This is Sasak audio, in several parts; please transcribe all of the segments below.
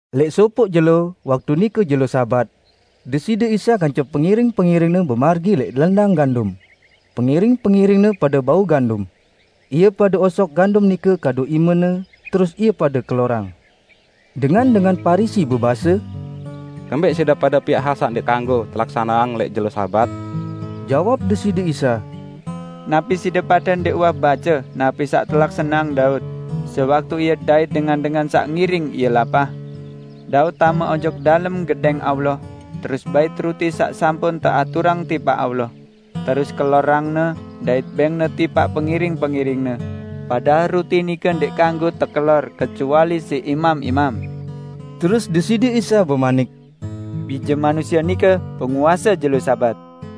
Lẽq sopoq jelo, waktu nike jelo Sabat, Deside Isa kance pengiring-pengiring-Ne bemargi lẽq lendang gandum. Pengiring-pengiring-Ne pade bau gandum. Ie pade osok gandum nike kadu imene, terus ie pade kelorang. Dengan-dengan Parisi bebase, "Kembẽq side pade piaq hal saq ndẽq tekanggo telaksaneang lẽq jelo Sabat?" Jawab Deside Isa, "Napi side pade ndẽq uwah bace napi saq telaksaneang Daud, sewaktu ie dait dengan-dengan saq ngiring ie lapah? Daud tame ojok dalem Gedẽng Allah terus bait ruti saq sampun teaturang tipaq Allah, terus kelorangne dait bẽngne tipaq pengiring-pengiringne, padahal ruti nike ndẽq kanggo tekelor kecuali siq imam-imam?" Terus Deside Isa bemanik, "Bije Manusie nike Penguase jelo Sabat!"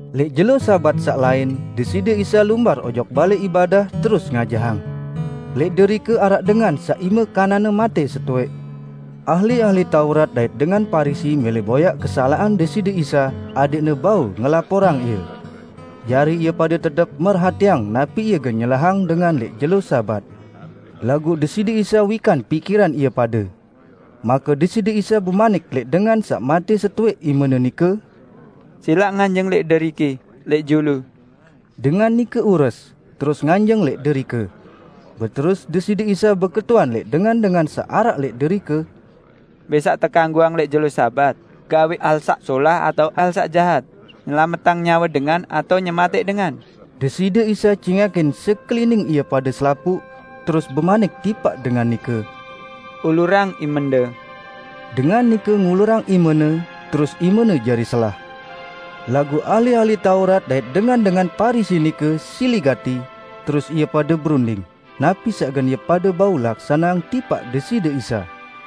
Lẽq jelo Sabat saq lain, Deside Isa lumbar ojok balẽ ibadah terus ngajahang. Lẽq derike araq dengan saq ime kananne matẽ setowẽq. Ahli-ahli Taurat dait dengan Parisi mẽlẽ boyaq kesalaqan Deside Isa adẽqne bau ngelaporang Ie. Jari ie pade tetep merhatiang napi Ie gen nyelahang dengan lẽq jelo Sabat. Laguq Deside Isa wikan pikiran ie pade. Make Deside Isa bemanik lẽq dengan saq matẽ setowẽq imene nike, "Silaq nganjeng lẽq deriki lẽq julu!" Dengan nike ures, terus nganjeng lẽq derike. Beterus Deside Isa beketuan lẽq dengan-dengan saq araq lẽq derike, "Mbẽ saq tekanggoang lẽq jelo Sabat, solah atao gawẽq hal saq jahat, nyelametang nyawe dengan atao nyematẽq dengan?" Deside Isa cingakin sekelining ie pade selapuq, terus bemanik tipaq dengan nike, "Ulurang imende." Dengan nike ngulurang imene, terus imene jari selah. Laguq ahli-ahli Taurat dait dengan-dengan Parisi nike sili gati, terus ie pade berunding, napi saq gen ie pade bau laksaneang tipaq Deside Isa.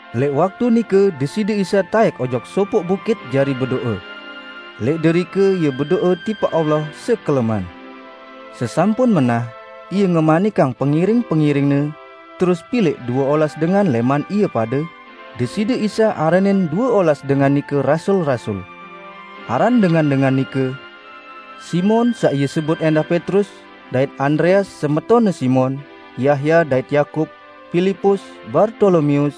Lẽq waktu nike Deside Isa taẽk ojok sopoq bukit jari bedo'e. Lẽq derike Ie bedo'e tipaq Allah sekeleman. Sesampun menah, Ie ngemanikang pengiring-pengiring-Ne, terus pilẽq due olas dengan lẽman ie pade, Deside Isa aranin due olas dengan nike rasul-rasul. Aran dengan-dengan nike: Simon (saq Ie sebut ẽndah Petrus), dait Andreas semetonne Simon; Yahya dait Yakub, Pilipus, Bartolomeus,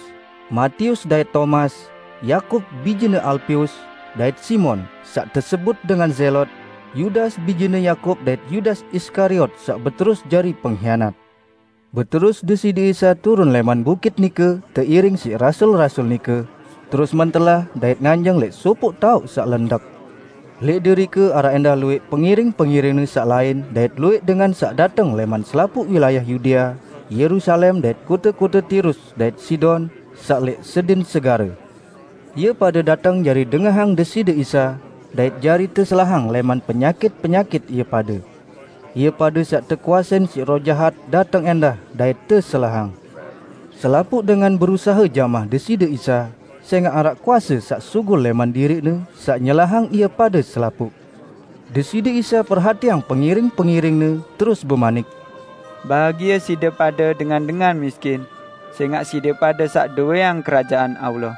Matius dait Tomas, Yakub bijene Alpeus, dait Simon (saq tesebut dengan Zelot), Yudas bijene Yakub dait Yudas Iskariot saq beterus jari penghianat. Beterus Deside Isa turun lẽman bukit nike teiring siq rasul-rasul nike, terus mentelah dait nganjeng lẽq sopoq taoq saq lendek. Lẽq derike araq ẽndah luwẽq pengiring-pengiring-Ne saq lain dait luwẽq dengan saq dateng lẽman selapuq wilayah Yudea, Yerusalem dait kote-kote Tirus dait Sidon saq lẽq sedin segare. Ie pade dateng jari dengahang Deside Isa, dait jari teselahang lẽman penyakit-penyakit ie pade. Ie pade saq tekuasein siq roh jahat dateng ẽndah dait teselahang. Selapuq dengan berusahe jamah Deside Isa, sẽngaq araq kuase saq sugul lẽman diriq-Ne saq nyelahang ie pade selapuq. Deside Isa perhatiang pengiring-pengiring-Ne terus bemanik, "Bahagie side pade dengan-dengan miskin, sẽngaq side pade saq dowẽang Kerajaan Allah!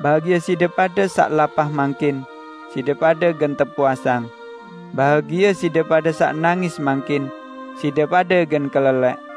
Bahagie side pade saq lapah mangkin; side pade gen tepuasang! Bahagie side pade saq nangis mangkin; side pade gen kelelẽq!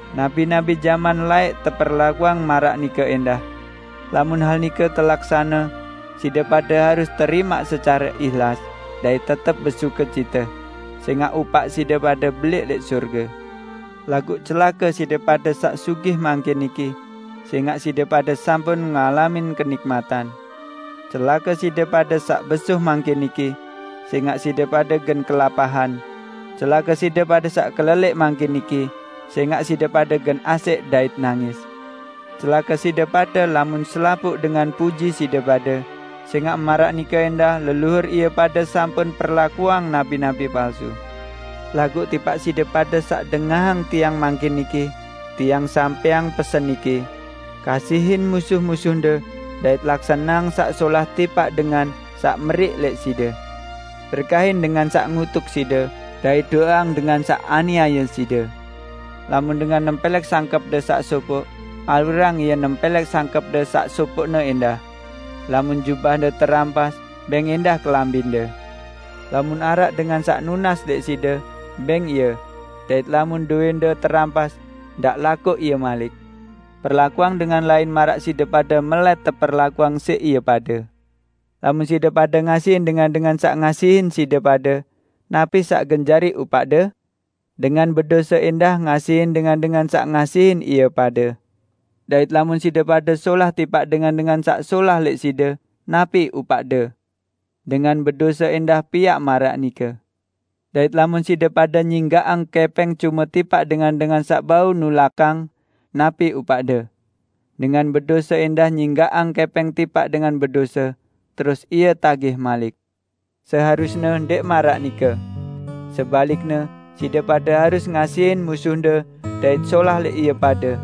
Nabi-nabi jaman laẽq teperlakuang maraq nike ẽndah. Lamun hal nike telaksane, side pade harus terimaq secare ihlas, dait tetep besukecite, sẽngaq upaq side pade belẽq lẽq sorge. Laguq celake side pade saq sugih mangkin niki; sẽngaq side pade sampun ngalamin kenikmatan! Celake side pade saq besuh mangkin niki; sẽngaq side pade gen kelapahan! Celake side pade saq kelelẽq mangkin niki; sẽngaq side pade gen asẽq dait nangis! Celake side pade lamun selapuq dengan puji side pade; sẽngaq maraq nike ẽndah leluhur ie pade sampun perlakuang nabi-nabi palsu." "Laguq tipaq side pade saq dengahang Tiang mangkin niki, Tiang sampẽang pesen niki: Kasihin musuh-musuhde, dait laksaneang saq solah tipaq dengan saq meriq lẽq side. Berkahin dengan saq ngutuk side, dait do'eang dengan saq aniaye side. Lamun dengan nempẽlẽk sangkẽpde saq sopoq, alurang ie nempẽlẽk sangkẽpde saq sopoqne ẽndah. Lamun jubahde terampas, bẽng ẽndah kelambinde. Lamun araq dengan saq nunas lẽq side, bẽng ie; dait lamun dowẽnde terampas, ndaq lakoq ie malik. Perlakuang dengan lain maraq side pade melẽt teperlakuang siq ie pade. Lamun side pade ngasihin dengan-dengan saq ngasihin side pade, napi saq gen jari upaqde? Dengan bedose ẽndah ngasihin dengan-dengan saq ngasihin ie pade! Dait lamun side pade solah tipaq dengan-dengan saq solah lẽq side, napi upaqde? Dengan bedose ẽndah piaq maraq nike! Dait lamun side pade nyinggaqang kẽpẽng cume tipaq dengan-dengan saq bau nulakang, napi upaqde? Dengan bedose ẽndah nyinggaqang kẽpẽng tipaq dengan bedose, terus ie tagih malik! Seharusne ndẽq maraq nike! Sebalikne side pade harus ngasihin musuhde dait solah lẽq ie pade.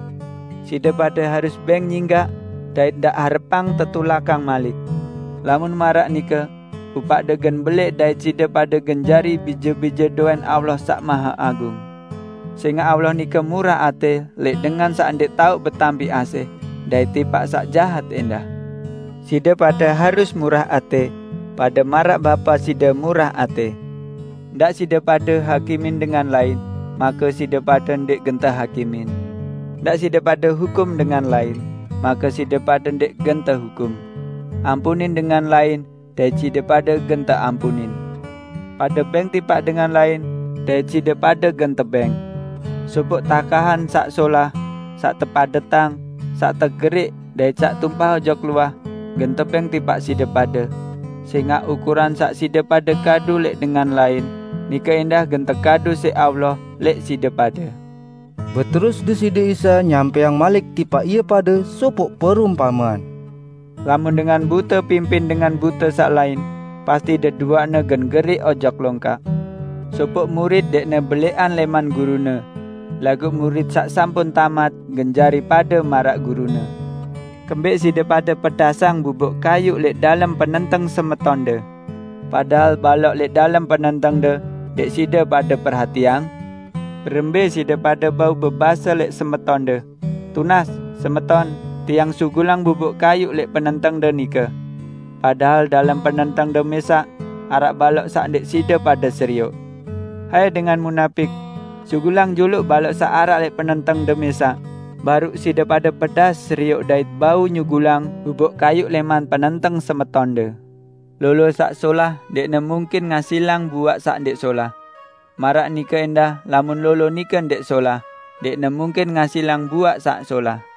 Side pade harus bẽng nyinggaq, dait ndaq harepang tetulakang malik. Lamun maraq nike, upaqde gen belẽq dait side pade gen jari bije-bije dowẽn Allah Saq Maheagung. Sẽngaq Allah nike murah atẽ lẽq dengan saq ndẽq tao betampi asih, dait tipaq saq jahat ẽndah. Side pade harus murah atẽ, pade maraq Bapa side murah atẽ." "Ndaq side pade hakimin dengan lain, make side pade ndẽq gen tehakimin. Ndaq side pade hukum dengan lain, make side pade ndẽq gen tehukum; ampunin dengan lain dait side pade gen teampunin. Pade bẽng tipaq dengan lain, dait side pade gen tebẽng: Sopoq takahan saq solah, saq tepadetang, saq tegerik dait saq tumpah ojok luah gen tebẽng tipaq side pade. Sẽngaq ukuran saq side pade kadu lẽq dengan lain, nike ẽndah gen tekadu siq Allah lẽq side pade." Beterus Deside Isa nyampẽang malik tipaq ie pade sopoq perumpamean: "Lamun dengan bute pimpin dengan bute saq lain, pasti deduaqne gen geriq ojok longkak. Sopoq murit ndẽqne belẽqan lẽman gurune, laguq murit saq sampun tamat gen jari pade maraq gurune. Kembẽq side pade pedaseng bubuk kayuq lẽq dalem penenteng semetonde, padahal balok lẽq dalem penentengde, ndẽq side pade perhatiang? Berembẽ side pade bau bebase lẽq semetonde, 'Tunas, semeton, tiang sugulang bubuk kayuq lẽq penentengde nike,' padahal dalem penentengde mẽsaq araq balok saq ndẽq side pade serioq? Hai dengan munapik! Sugulang juluq balok saq araq lẽq penentengde mẽsaq, baruq side pade pedas serioq dait bau nyugulang bubuk kayuq lẽman penenteng semetonde." "Lolo saq solah ndẽqne mungkin ngasilang buaq saq ndẽq solah. Maraq nike ẽndah lamun lolo nike ndẽq solah, ndẽqne mungkin ngasilang buaq saq solah.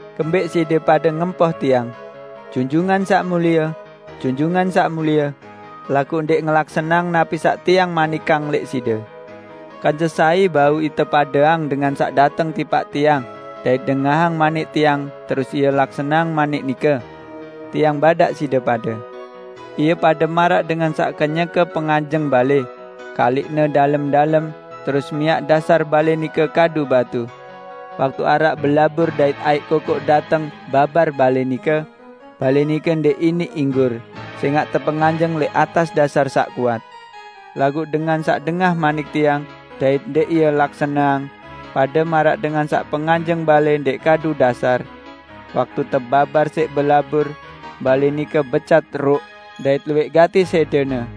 "Kembẽq side pade ngempoh Tiang, 'Junjungan Saq Mulie, Junjungan Saq Mulie,' laguq ndẽq ngelaksaneang napi saq Tiang manikang lẽq side? Kance sai bau ite padeang dengan saq dateng tipaq Tiang dait dengahang manik Tiang terus ie laksaneang manik nike? -- Tiang badaq side pade --. Ie pade maraq dengan saq kenyeke penganjeng balẽ, kaliqne dalem-dalem, terus miaq dasar balẽ nike kadu batu. Waktu araq belabur dait aiq kokoq dateng babar balẽ nike, balẽ nike ndẽq iniq inggur, sẽngaq tepenganjeng lẽq atas dasar saq kuat. Laguq dengan saq dengah manik Tiang dait ndẽq ie laksaneang, pade maraq dengan saq penganjeng balẽ ndẽq kadu dasar. Waktu tebabar siq belabur, balẽ nike becat ruk; dait luwẽq gati sẽdene!"